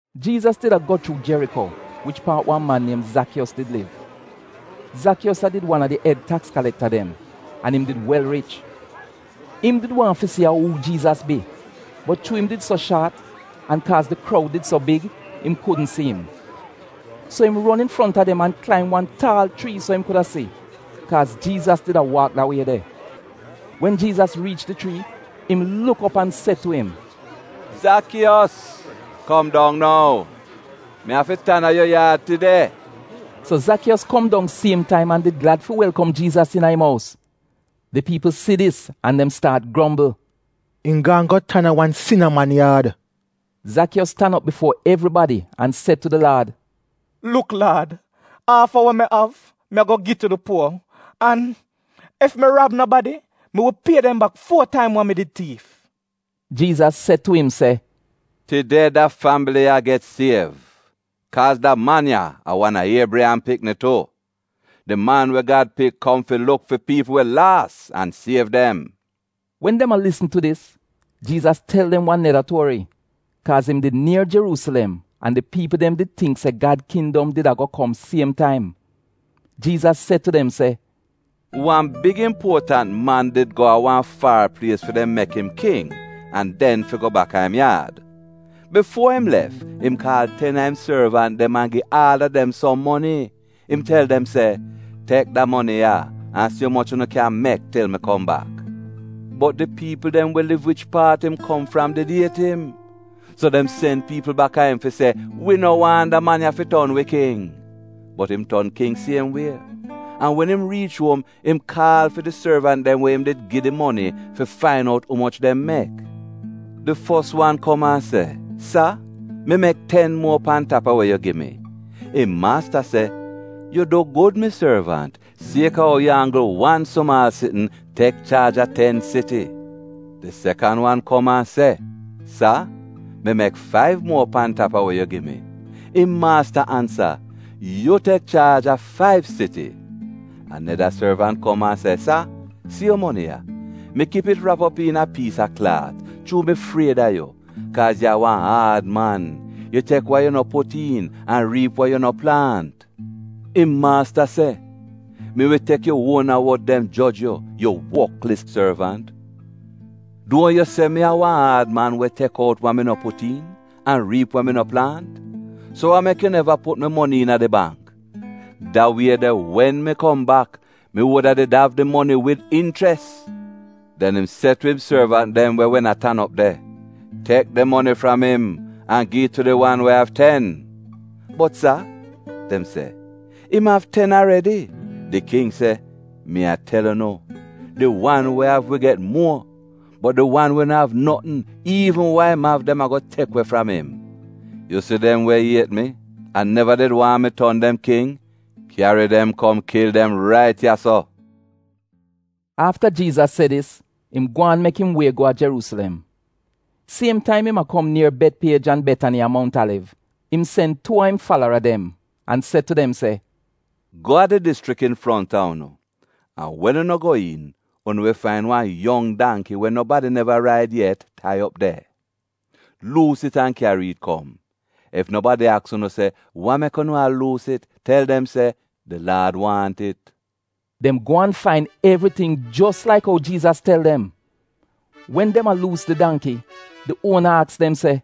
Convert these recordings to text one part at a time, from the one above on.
Jiizas did ago chuu Jeriko, wich paat wan man niem Zakiyos did liv. Zakiyos a did wan a di ed taks kalekta dem an im did wel rich. Im did waahn fi si a uu Jiizas bi, bot chuu im did so shaat an kaaz di kroud did so big, im kudn si im. So im ron infronta dem an klaim wan taal chrii so im kuda si, kaaz Jiizas did a waak da wie de. Wen Jiizas riich di chrii, im luk op an se tu im se, “Zakiyos, kom dong nou. Mi afi tan a yu yaad tide.” So Zakiyos kom dong siem taim an did glad fi welkom Jiizas iina im ous. Di piipl si dis an dem staat grombl, “Im gaan go tan a wan sina man yaad.” Zakiyos tan op bifuo evribadi an se tu di Laad, “Luk Laad, aaf a we mi av, mi ago gi tu di puo, an ef mi rab nobadi, mi wi pie dem bak fuo taim wa mi did tiif.” Jiizas se tu im se, “Tide da fambili ya get siev, kaaz da man ya, a wan a Iebriyam pikni tu. Di Man we Gad Pik kom fi luk fi piipl we laas an siev dem.” Wen dem a lisn tu dis, Jiizas tel dem wan neda tuori, kaaz im did nier Jeruusilem an di piipl dem did tingk se Gad kindom did ago kom siem taim. Jiizas se tu dem se, “Wan big impuotant man did go a wan far plies fi dem mek im King an den fi go baka im yaad. Bifuo im lef, im kaal ten a im sorvant dem an gi aal a dem som moni. Im tel dem se, ‘Tek da moni ya an si umoch unu kyan mek til mi kom bak.’ “Bot di piipl dem we liv wich paat im kom fram did iet im. So dem sen piipl baka im fi se, ‘Wi no waahn da man ya fi ton wi King.’ “Bot im ton King siem wie, an wen im riich uom, im kaal fi di sorvant dem we im did gi moni, fi fain out umoch dem mek. “Di fos wan kom an se, ‘Sa, mi mek ten muo pan tap a we yu gi mi.’ “Im maasta se, ‘Yu du gud mi sorvant! Sieka ou yu anggl wan sumaal sitn, tek chaaj a ten siti.’ “Di sekan wan kom an se, ‘Sa, mi mek faiv muo pan tap a we yu gi mi.’ “Im maasta ansa, ‘Yu tek chaaj a faiv siti.’ “Aneda sorvant kom an se, ‘Sa, si yu moni ya. Mi kip it rap op iina piis a klaat chuu mi fried a yu, kaaz yu a wan aad man. Yu tek wa yu no put iin an riip wa yu no plaant.’ “Im maasta se, ‘Mi wi tek yu uona wod dem joj yu, yu wotlis sorvant! Duo yu se mi a wan aad man we tek out wa mi no put iin, an riip wa mi no plaant? So wa mek yu neva put mi moni iina di bangk? Da wie de wen mi kom bak, mi wuda did av di moni wid inchres.’ “Den im se tu im sorvant dem we wen a tan op de, ‘Tek di moni fram im an gi it tu di wan we av ten.’ “ ‘Bot Sa,’ dem se, ‘im av ten aredi!’ “Di King se, ‘Mi a tel unu, di wan we av, wi get muo, bot di wan we no av notn, iivn wa im av dem ago tek we fram im. Yu si dem we iet mi an neva did waahn mi ton dem king, kyari dem kom kil dem rait ya-so.’” Afta Jiizas se dis, im gwaan mek im wie go a Jeruusilem. Siem taim im a kom nier Betpiej an Betani a Mount Aliv, im sen tuu a im falara dem, an se tu dem se, “Go a di dischrik infronta unu, an wen wen unu go iin, unu wi fain wan yong dangki we nobadi neva raid yet tai op de. Luus it an kyari it kom. Ef nobadi aks unu se, ‘Wa mek unu a luus it?’ tel dem se, ‘Di Laad waahn it.’” Dem go an fain evriting jos laik ou Jiizas tel dem. Wen dem a luus di dangki, di uona aks dem se,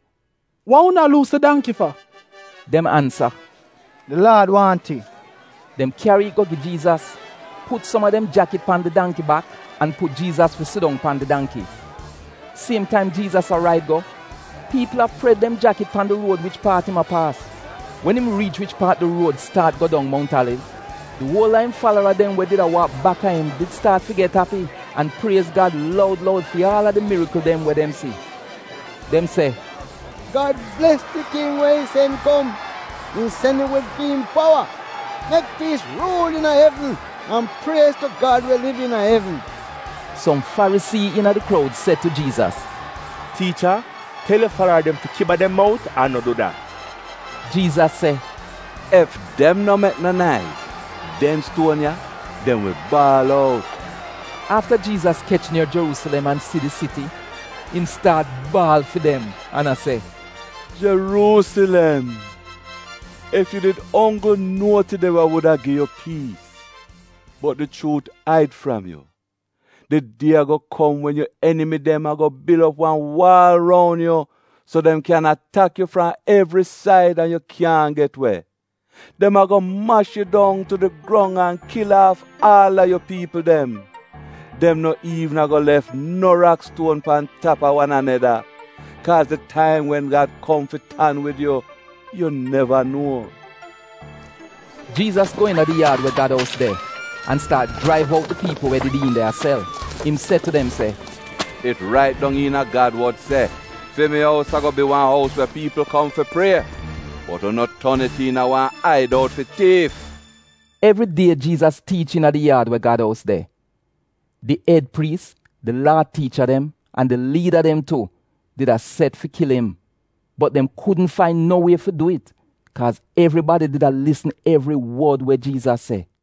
“Wa unu a luus di dangki fa?” Dem ansa, “Di Laad waahn it.” Dem kyari it go gi Jiizas, put som a dem jakit pan di dangki bak an put Jiizas fi sidong pan di dangki. Siem taim Jiizas a raid go, piipl a pred dem jakit pan di ruod wich paat im a paas. Wen im riich wich paat di ruod staat go dong Mount Aliv, di uol a im falara dem we did a waak baka im did staat fi get api an priez Gad loud loud fi aal a di mirikl dem we dem si. Dem se, “Gad bles di King we im sen kom! Im sen im wid fi'im powa!” “Mek piis ruul iina evn, an priez tu Gad we liv iina evn.” Som Farisii iina di kroud se tu Jiizas, “Tiicha, tel yu falara dem fi kiba dem mout an no du dat.” Jiizas se, “Ef dem no mek no naiz, dem stuon ya — dem wi baal out.” Afta Jiizas kech nier Jeruusilem an si di siti, im staat baal fi dem an a se, “Jeruusilem, Ef yu di onggl nuo tide wa wuda gi yu piis — bot di chuut aid fram yu. Di die ago kom wen yu enimi dem ago bil op wan waal roun yu so dem kyan atak yu fram evri said an yu kyaahn get we. Dem ago mash yu dong tu di grong an kil aaf aal a yu piipl dem. Dem no iivn ago lef no rakstuon pan tap a wan aneda, kaaz di taim wen Gad kom fi tan wid yu, yu neva nuo.” Jiizas go iina di yaad we Gad ous de an staat jraiv out di piipl we did iin de a sel. Im se tu dem se, “It rait dong iina Gad wod se, ‘Fi mi ous ago bi wan ous we piipl kom fi prie,’ bot unu ton it iina ‘wan aid out fi tiif.’”” Evri die Jiizas tiich iina di yaad we Gad ous de. Di ed priis, di Laa tiicha dem an di liida dem tu, did a set fi kil im. Bot dem kudn fain no wie fi du it, kaaz evribadi did a lisn evri wod we Jiizas se.